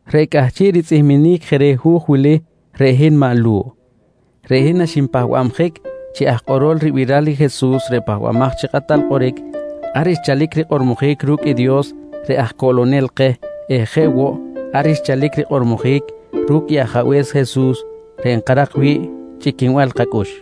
Reꞌ cꞌahchiꞌ ritzꞌihminic je reh hu̱j wili, reꞌ hin maꞌ Lu̱ꞌ. Reꞌ hin naxinpahbabjic chi aj kꞌorol ribiral i Jesus reꞌ Pahbamaj chi Kꞌatal Kꞌoric, ar xchalic rikꞌormojic ru̱cꞌ i Dios reꞌ aj coꞌlonel keh eh jeꞌ woꞌ ar xchalic rikꞌormojic ru̱cꞌ i Ajabe̱s Jesus reꞌ nkarak wi̱ꞌ chꞌiquinbal kacꞌux.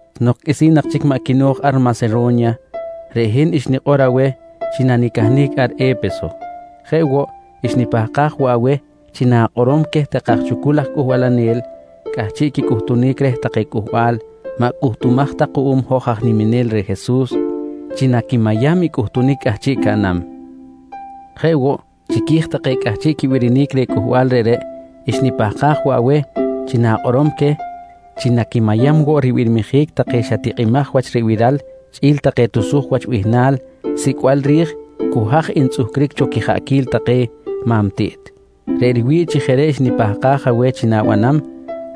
Nok qꞌuisi̱n nak chic maꞌ quino̱j ar Masero̱nya, reꞌ hin xnikꞌor aweh chi na̱cahnic ar E̱peso. Jeꞌ woꞌ, xnipahkaj woꞌ aweh chi na̱kꞌorom queh take aj chucul aj cꞌuhbalanel cꞌahchiꞌ quicꞌuhtunic reh take cꞌuhbal maꞌ cꞌuhtumaj ta kuꞌum hoj aj niminel reh Jesus chi naquimayam i cꞌuhtunic cꞌahchiꞌ caꞌnam. Jeꞌ woꞌ chiqui̱j take cꞌahchiꞌ quibirinic reh cꞌuhbal reꞌreꞌ, xnipahkaj woꞌ aweh chi na̱kꞌorom queh chi quimay woꞌ ribirmijic take xa tikꞌimaj wach ribiral chꞌi̱l take tusuj wach bihnal sicꞌbal ri̱j cu haj ntzꞌuhcric cho quijaꞌquil take ma̱m tiꞌt. Reꞌ riwi̱ꞌ chi jeꞌ reꞌ xnipahkaj aweh chi na̱banam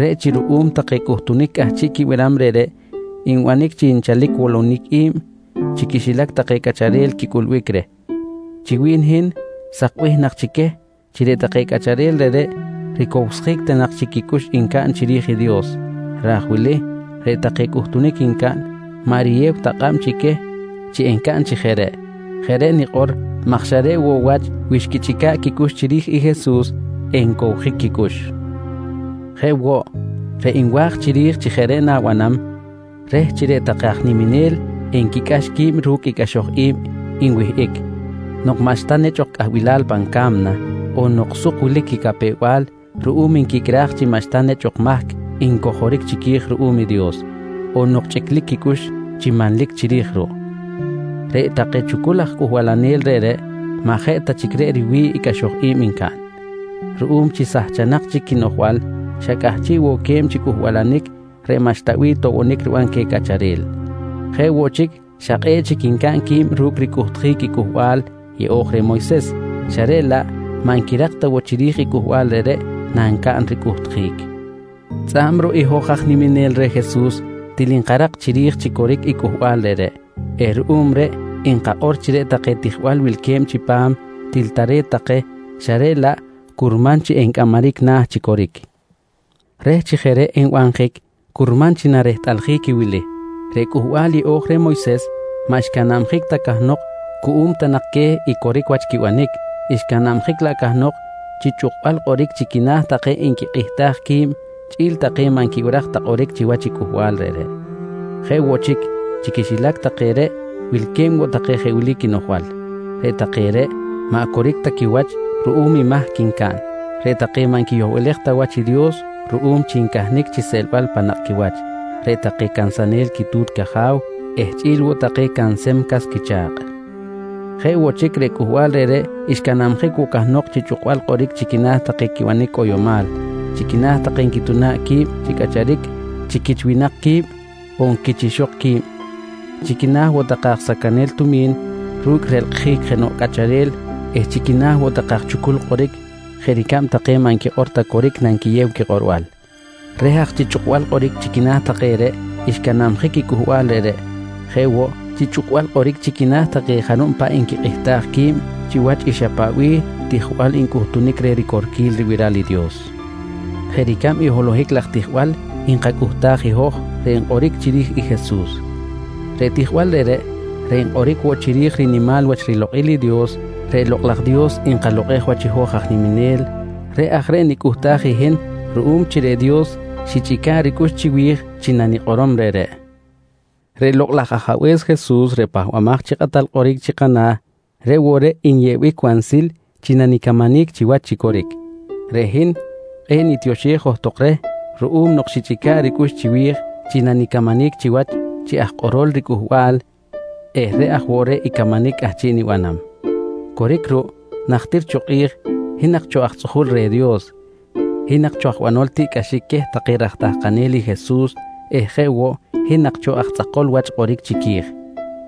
reꞌ chi ruꞌum take cꞌuhtunic cꞌahchiꞌ quibiram reꞌreꞌ nbanic chi nchalic wolonic i̱b chi quixilac take cꞌacharel quicꞌulbic reh. Chi wi̱n hin, sak bih nak chi queh chi reꞌ take cꞌacharel reꞌreꞌ ricowsjic ta nak quicꞌux xcaꞌn chiri̱j i Dios, ra̱j wili reꞌ take cꞌuhtunic ncaꞌn maꞌ riyew ta kꞌab queh chi encaꞌn chi jeꞌ reꞌ. Jeꞌ reꞌ nikꞌor maj xa reꞌ woꞌ wach wi xquichꞌica̱ꞌ quicꞌux chiri̱j i Jesus encowjic quicꞌux. Jeꞌ woꞌ, reꞌ nwa̱j chiri̱j chi jeꞌ reꞌ na̱banam reh chi reꞌ take aj niminel enquicꞌax qui̱b ru̱cꞌ i cꞌaxoj i̱b nwihꞌic nok maꞌxta nechꞌ ok cꞌahbilal pan ca̱mna, on nok suk wilic quicapew-bal ruꞌum nquicꞌraj chi maꞌxta jenoꞌ mahc ncojoric chiqui̱j ruꞌum i Dios, on nok chꞌiclic quicꞌux chi manlic chiri̱j ruꞌ. Reꞌ take chucul laj aj cꞌuhbalanel reꞌreꞌ maꞌ jeꞌ ta chic reꞌ riwi̱ꞌ i cꞌaxoj i̱b ncaꞌn. Ruꞌum chi sahchanak chic quinoꞌjbal xa cꞌahchiꞌ woꞌ que̱b chi cꞌuhbalanic reꞌ maꞌxta bih toꞌbonic riban queh cꞌacharel. Jeꞌ woꞌ chic, xa kꞌe̱ꞌ chic ncaꞌn qui̱b ru̱cꞌ ricꞌuhtjic i Cꞌuhbal Yeꞌo̱j reh Moyses xa reꞌ laꞌ maꞌ nquirak ta woꞌ chiri̱j i cꞌuhbal reꞌreꞌ nancaꞌn ricꞌuhtjic. Tzꞌa̱b i hoj aj niminel reh Jesus til nkarak chiri̱j chi coric i cꞌuhbal reꞌreꞌ eh ruꞌum reꞌ nkakꞌor chi reꞌ take tijbal wilque̱b chipam til tare̱t take xa reꞌ laꞌ curman chi encꞌamaric na̱ chi coric. Reh chi jeꞌ reꞌ enbanjic, curman chi narehtꞌaljic i wili: Reꞌ Cꞌuhbal Yeꞌo̱j reh Moyses maꞌ xcanabjic ta cahnok cuꞌum ta nak queh i coric wach quibanic, xcanabjic laꞌ cahnok chi chꞌukbal kꞌoric chi quina̱ take nquikꞌihtaj qui̱b chꞌi̱l take maꞌ nquibiraj ta kꞌoric chiwach i cꞌuhbal reꞌreꞌ. Jeꞌ woꞌ chic chi quixilac take reꞌ wilque̱b woꞌ take jeꞌ wili quinoꞌjbal: Reꞌ take reꞌ maꞌ coric ta quiwach ruꞌum i mahc ncaꞌn, reꞌ take maꞌ nquiyohlej ta wach i Dios ruꞌum chi ncahnic chi seꞌlbal pan nakꞌquiwach, reꞌ take cansanel quitu̱t caja̱w eh chꞌi̱l woꞌ take cansem cas quicha̱kꞌ. Jeꞌ woꞌ chic reꞌ cꞌuhbal reꞌreꞌ xcanabjic woꞌ cahnok chi chꞌukbal kꞌoric chi quina̱ take quibanic cꞌoyomal, chi quina̱ take nquituna̱ꞌ qui̱b chi cꞌacharic chi quich winak qui̱b on quich ixok qui̱b, chi quina̱ woꞌ take aj sacanel tumi̱n ru̱cꞌ relkꞌjic jenoꞌ cꞌacharel eh chi quina̱ woꞌ take aj chucul kꞌoric jeꞌ ricab take maꞌ nquikꞌor ta coric nanquiyew quikꞌorbal. Reh aj chi chꞌukbal kꞌoric chi quina̱ take reꞌ, xcanabjic i cꞌuhbal reꞌreꞌ jeꞌ woꞌ chi chꞌukbal kꞌoric chi quina̱ take jarub paꞌ nquikꞌihtaj qui̱b chiwach i xa paꞌ bih tijbal ncꞌuhtunic reh ricorquil ribiral i Dios jeꞌ ricab i holohic laj tijbal nkacꞌuhtaj i hoj reꞌ nkꞌoric chiri̱j i Jesus. Reꞌ tijbal reꞌreꞌ, reꞌ nkꞌoric woꞌ chiri̱j rinimal wach rilokꞌil i Dios i Lokꞌ laj Dios nkalokꞌej wach i hoj aj niminel, reꞌ aj reꞌ nicꞌuhtaj i hin ruꞌum chi reꞌ Dios xichꞌica̱ꞌ ricꞌux chiwi̱j nanikꞌorom reꞌreꞌ. Reꞌ Lokꞌ laj Ajabe̱s Jesus reꞌ Pahbamaj chi Kꞌatal Kꞌoric chi kana̱ reꞌ woꞌ reꞌ nyeꞌbic wansil chi nanicamanic chiwach chi coric. Reꞌ hin kꞌe̱ꞌ nitioxej johtok reh ruꞌum nok xichꞌica̱ꞌ ricꞌux chiwi̱j chi nanicamanic chiwach chi aj kꞌorol riCꞌuhbal eh reꞌ aj woꞌ reꞌ i camanic cꞌahchiꞌ nibanam. Coric ruꞌ, najtir cho kꞌi̱j hin nak cho aj tzꞌuju̱l reh i Dios, hin nak cho banol tiꞌcꞌaxic queh take raj tahkanel i Jesus eh jeꞌ woꞌ hin nak cho aj tzꞌakol wach kꞌoric chiqui̱j.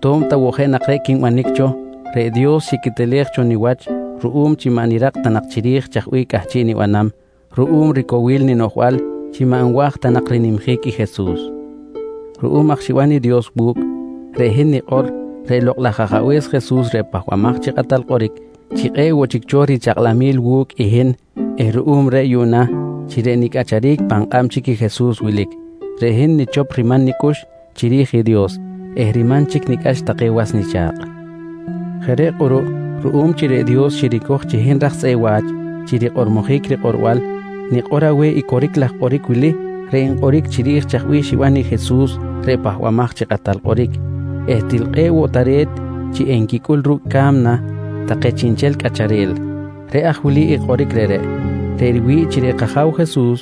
To̱b ta woꞌ jeꞌ nak reꞌ quinbanic cho, reꞌ Dios xiquetelej cho niwach ruꞌum chi maꞌ nirak ta nak chiri̱j chaj bih cꞌahchiꞌ nibanam ruꞌum ricowil ninoꞌjbal chi maꞌ nwa̱j ta nak rinimjic i Jesus. Ruꞌum aj xiban i Dios wu̱cꞌ, reꞌ hin nikꞌor reꞌ Lokꞌ laj Ajabe̱s Jesus reꞌ Pahbamaj chi Kꞌatal Kꞌoric chi kꞌe̱ꞌ woꞌ chic cho richakꞌlamil wu̱cꞌ i hin eh ruꞌum reꞌ yuꞌna chi reꞌ nicꞌacharic pan kꞌab chic i Jesus wilic, reꞌ hin nichop riman nicꞌux chiri̱j i Dios eh riman chic nicꞌax take was nicha̱kꞌ. Jeꞌ reꞌ kꞌuruꞌ, ruꞌum chi reꞌ Dios xiricoj chi hin raj tzꞌeꞌ wa̱ch chi rikꞌormojic rikꞌorbal, nikꞌor aweh i coric laj kꞌoric wili reꞌ nkꞌoric chiri̱j chaj bih xiban i Jesus reꞌ Pahbamaj chi Kꞌatal Kꞌoric eh til kꞌe̱ꞌ woꞌ tare̱t chi enquicꞌul ru̱cꞌ i ca̱mna take chiꞌnchel cꞌacharel. Reꞌ aj wili i kꞌoric reꞌreꞌ: Reꞌ riwi̱ꞌ chi reꞌ kAja̱w Jesus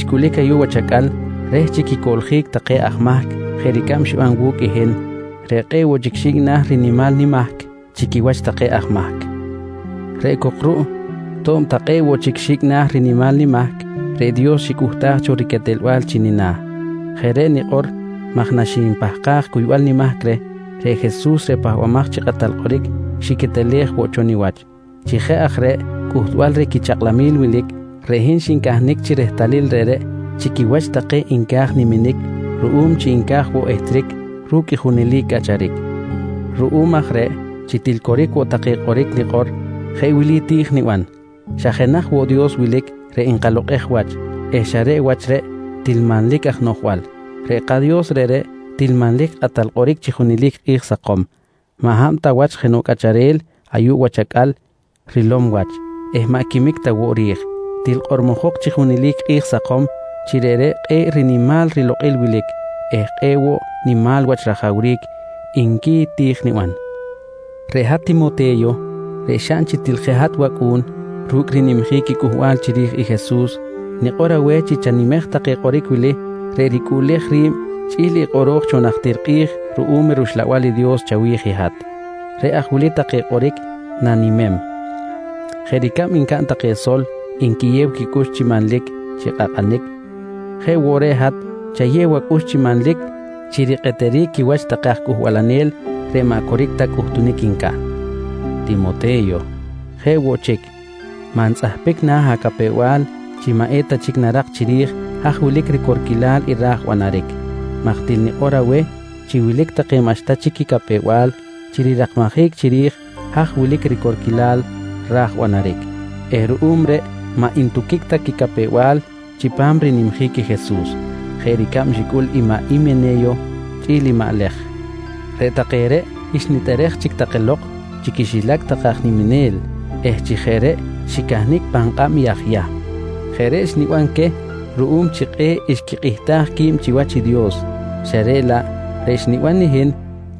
xcꞌulic ayuꞌ wach acꞌal, reh chi quicoꞌljic take aj mahc jeꞌ ricab xiban wu̱cꞌ i hin reꞌ kꞌe̱ꞌ woꞌ chic xi̱cꞌ na̱ rinimal nimahc chi quiwach take aj mahc. Reꞌ cok ruꞌ to̱b ta kꞌe̱ꞌ woꞌ chic xi̱cꞌ na̱ rinimal nimahc, reꞌ Dios xicꞌuhtaj cho riquetelbal chi nina̱. Jeꞌ reꞌ nikꞌor maj naxnipahkaj cuybal nimahc reh, reꞌ Jesus reꞌ Pahbamaj chi Kꞌatal Kꞌoric xiquetelej woꞌ cho niwach. Chi jeꞌ aj reꞌ chi cꞌuhtbal reh quichakꞌlamil wilic, reꞌ hin xincahnic chi rehtalil reꞌreꞌ chi quiwach take nca̱j niminic ruꞌum chi nca̱j woꞌ ehtric ru̱cꞌ i junelic cꞌacharic. Ruꞌum aj reꞌ chi til woꞌ coric take kꞌoric nikꞌor, jeꞌ wili ti̱j niban: Xa jenaj woꞌ Dios wilic reꞌ nkalokꞌej wach eh xa reꞌ wach reꞌ til manlic aj noꞌjbal. Reꞌ kaDios reꞌreꞌ til manlic Kꞌatal Kꞌoric chi junelic i kꞌi̱j sakom, maꞌ hab ta wach jenoꞌ cꞌacharel ayuꞌ wach acꞌal rilom wach eh maꞌ quimic ta woꞌ ri̱j. Til kꞌormojok chi junelic kꞌi̱j sakom chi reꞌreꞌ kꞌe̱ꞌ rinimal rilokꞌil wilic eh kꞌe̱ꞌ woꞌ nimal wach rajawric, nqui ti̱j niban. Reꞌ hat Timote̱yo reꞌ xaꞌn chi til jeꞌ hat wacꞌu̱n ru̱cꞌ rinimjic i cꞌuhbal chiri̱j i Jesus, nikꞌor aweh chi chanimej take kꞌoric wili reꞌ ricꞌuꞌlej ri̱b chꞌi̱l i kꞌoro̱j cho najtir kꞌi̱j ruꞌum i rUxlabal i Dios chawi̱j i hat. Reꞌ aj wili take kꞌoric na̱nimem: Jeꞌ ricab ncaꞌn take sol nquiyew quicꞌux chi manlic chi kꞌakꞌanic jeꞌ woꞌ reꞌ hat chayew acꞌux chi manlic chi rikꞌeteric quiwach take aj cꞌuhbalanel reꞌ maꞌ coric ta quicꞌuhtunic ncaꞌn. Timote̱yo, jeꞌ woꞌ chic maꞌ ntzꞌahpic na̱ acapew-bal chi maꞌ eta chic narak chiri̱j haj wilic ricorquilal i ra̱j banaric maj til nikꞌor aweh chi wilic take maꞌxta chic quicapew-bal chi rirakmajic chiri̱j haj wilic i ricorquilal ra̱j banaric eh ruꞌum reꞌ maꞌ ntuhkic ta quicapew-bal chipam rinimjic i Jesus jeꞌ ricab xicꞌul maꞌ Himene̱yo chꞌi̱l maꞌ Lej. Reꞌ take reꞌ xnitꞌerej chic take lok chi quixilac take aj niminel eh chi jeꞌ reꞌ xicahnic pan kꞌab i aj Yahm. Jeꞌ reꞌ xniban queh ruꞌum chi kꞌe̱ꞌ xquikꞌihtaj qui̱b chiwach i Dios xa reꞌ laꞌ reꞌ xniban i hin,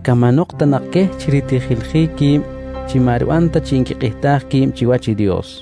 camanok ta nak queh chi ritijiljic qui̱b chi maꞌ riban ta chi nquikꞌihtaj qui̱b chiwach i Dios.